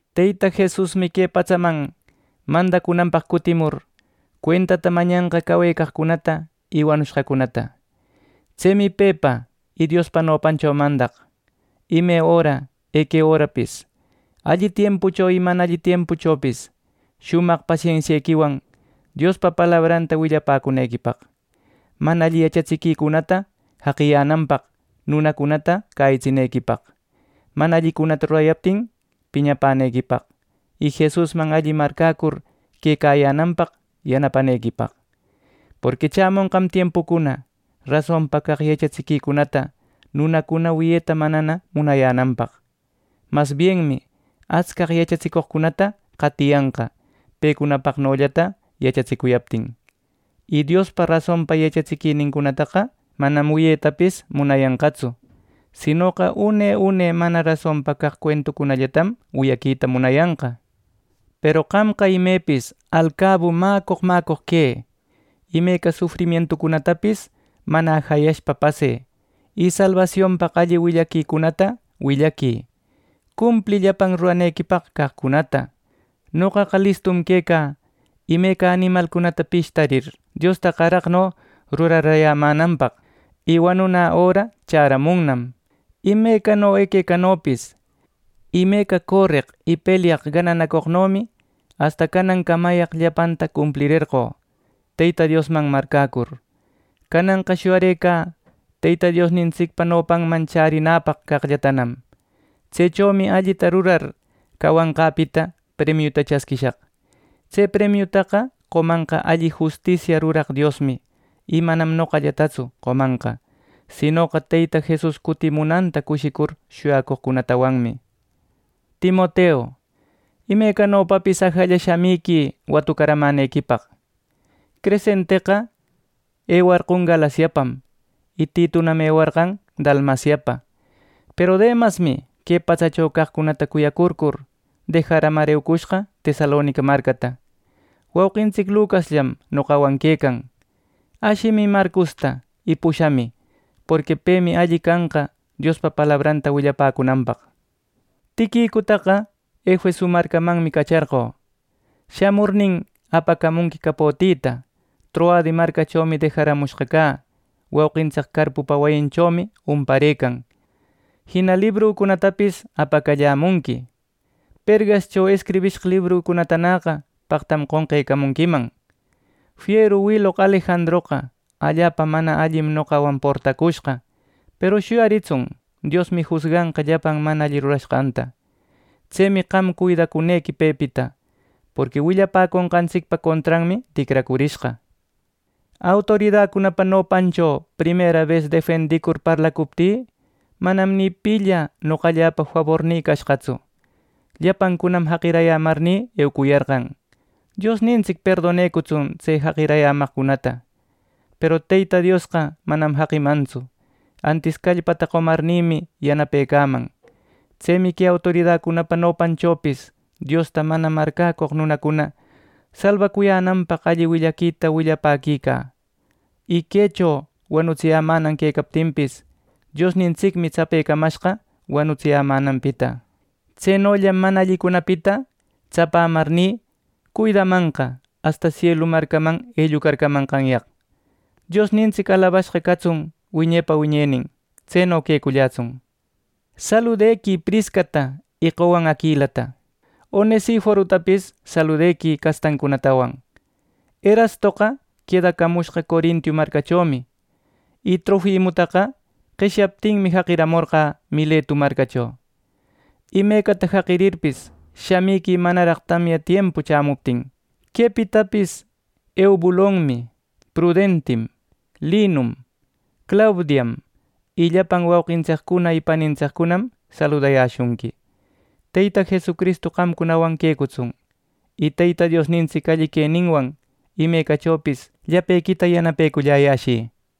Teyta Jesusmi que patsaman mandacunanpaq cutimur, cuentata mañanqa cawecaqcunata y wanushqacunata. Tsemi pepa y Diospa nopancho mandaq: ime öra eque örapis, alli tiempucho y mana alli tiempuchopis, shumaq pasensiequiwan Diospa palabranta willapäcunequipaq, mana alli yachatsiquicunata jaqiyänanpaq nunacunata cäyitsinequipaq, mana allicunata rurayaptin piñapänequipaq, y Jesusman alli marcäcur quecayänanpaq yanapanequipaq. Porqui chämonqam tiempucuna rasonpa caq yachatsiquicunata nunacuna wiyeta manana munayänanpaq. Masbienmi atscaq yachatsicoqcunata qatiyanqa pecunapaqnollata yachatsicuyaptin; y Diospaq rasonpa yachatsiquicunataqa manam wiyetapis munayanqatsu; sinoqa, une une mana rasonpa caq cuentucunallatam wiyaquita munayanqa. Peru qamqa imepis alcabu mäcoq mäcoq quë. Imeca sufrimientucunatapis mana ajayashpa pasë, y salbasionpaq alli willaquicunata willaquï. Cumplï llapan ruranequipaq caqcunata. Noqaqa listu quecä imeca animalcunata pishtarir, Diosta qaraqno rurarayämänanpaq; y wanunä öra chäramunnam. Imecano equecanopis, imeca coreq y pelyaq gananacoqnomi asta canancamayaq llapanta cumplirerqö Teyta Diosman marcäcur. Cananqa shuyarëcä Teyta Diosnintsicpa nopanman chärinäpaq caqllatanam. Tsechomi allita rurar cawashqäpita premiuta chasquishaq. Tse premiutaqa qomanqa alli justisiata ruraq Diosmi; y manam noqallatatsu qomanqa, sinoqa Teyta Jesus cutimunanta cushicur shuyacoqcunatawanmi. Timoteu, imecanopapis ajalla shamïquï watucaramänequipaq. Crescenteqa ewarqon Galaciapam y Titunam ewarqan Dalmaciapa. Peru Demasmi que patsacho caqcunata cuyacurcur, dejaramar eucushqa Tesalonica marcata. Wauqintsic Lucasllam noqawan quecan. Ashimï Marcosta y pushamï, porqui pemi alli canqa Diospa palabranta willapäcunanpaq. Tiquicutaqa Efeso marcamanmi cacharqö. Shamurnin, apacamunqui capotïta Troade marcachomi dejaramushqa cä. Wauqintsic Carpupa wayinchomi umparëcan. Jina librücunatapis apacallämunqui. Pergashcho escribishqa librücunatanäqa paqtam qonqecamunquiman. Fieru wiloq Alejandroqa allapa mana allim noqawan portacushqa; peru shuyaritsun Diosmi jusganqa llapan mana alli rurashqanta. Tsemi qam cuidacunequi pepita, porqui willapäconqantsicpa contranmi ticracurishqa. Autoridacunapa nopancho primerabes defendicur parlacuptï, manam ni pilla noqalläpa fabornï cashqatsu; llapancunam jaqirayämarnï eucuyarqan. Diosnintsic perdonecutsun tse jaqirayämaqcunata. Peru Teyta Diosqa manam jaqimantsu. Antis callpata qomarnïmi yanapecaman. Tsemi que autoridacunapa nopanchopis Diosta mana marcäcoq nunacuna salbacuyänanpaq alli willaquita willapäquicä, y quecho wanutsiyämänan quecaptinpis, Diosnintsicmi tsapecamashqa wanutsiyämänanpita. Tsenollam mana allicunapita tsapamarni, cuidamanqa asta sielu marcaman ellucarcamanqanyaqmi. ¡Diosnintsic alabashqa catsun wiñepa wiñenin! Tseno quecullätsun. Saludequï Priscata y qowan Aquilata. Onesiforotapis saludequï castancunatawan. Erastoqa quedacamushqa Corinto marcachomi; y Trofimotaqa qeshyaptinmi, jaqiramorqä Miletu marcacho. Imecata jaqirirpis, shamiquï manaraq tamya tiempu chämuptin. Quepitapis Eubulom, Pudentim, Linum, Claudiam y llapan wauqintsiccuna y panintsiccunam saludayäshunqui. Teyta Jesucristu qamcunawan quecutsun, y Teyta Diosnintsic alli queninwan imecachopis llapequita yanapeculläyäshï.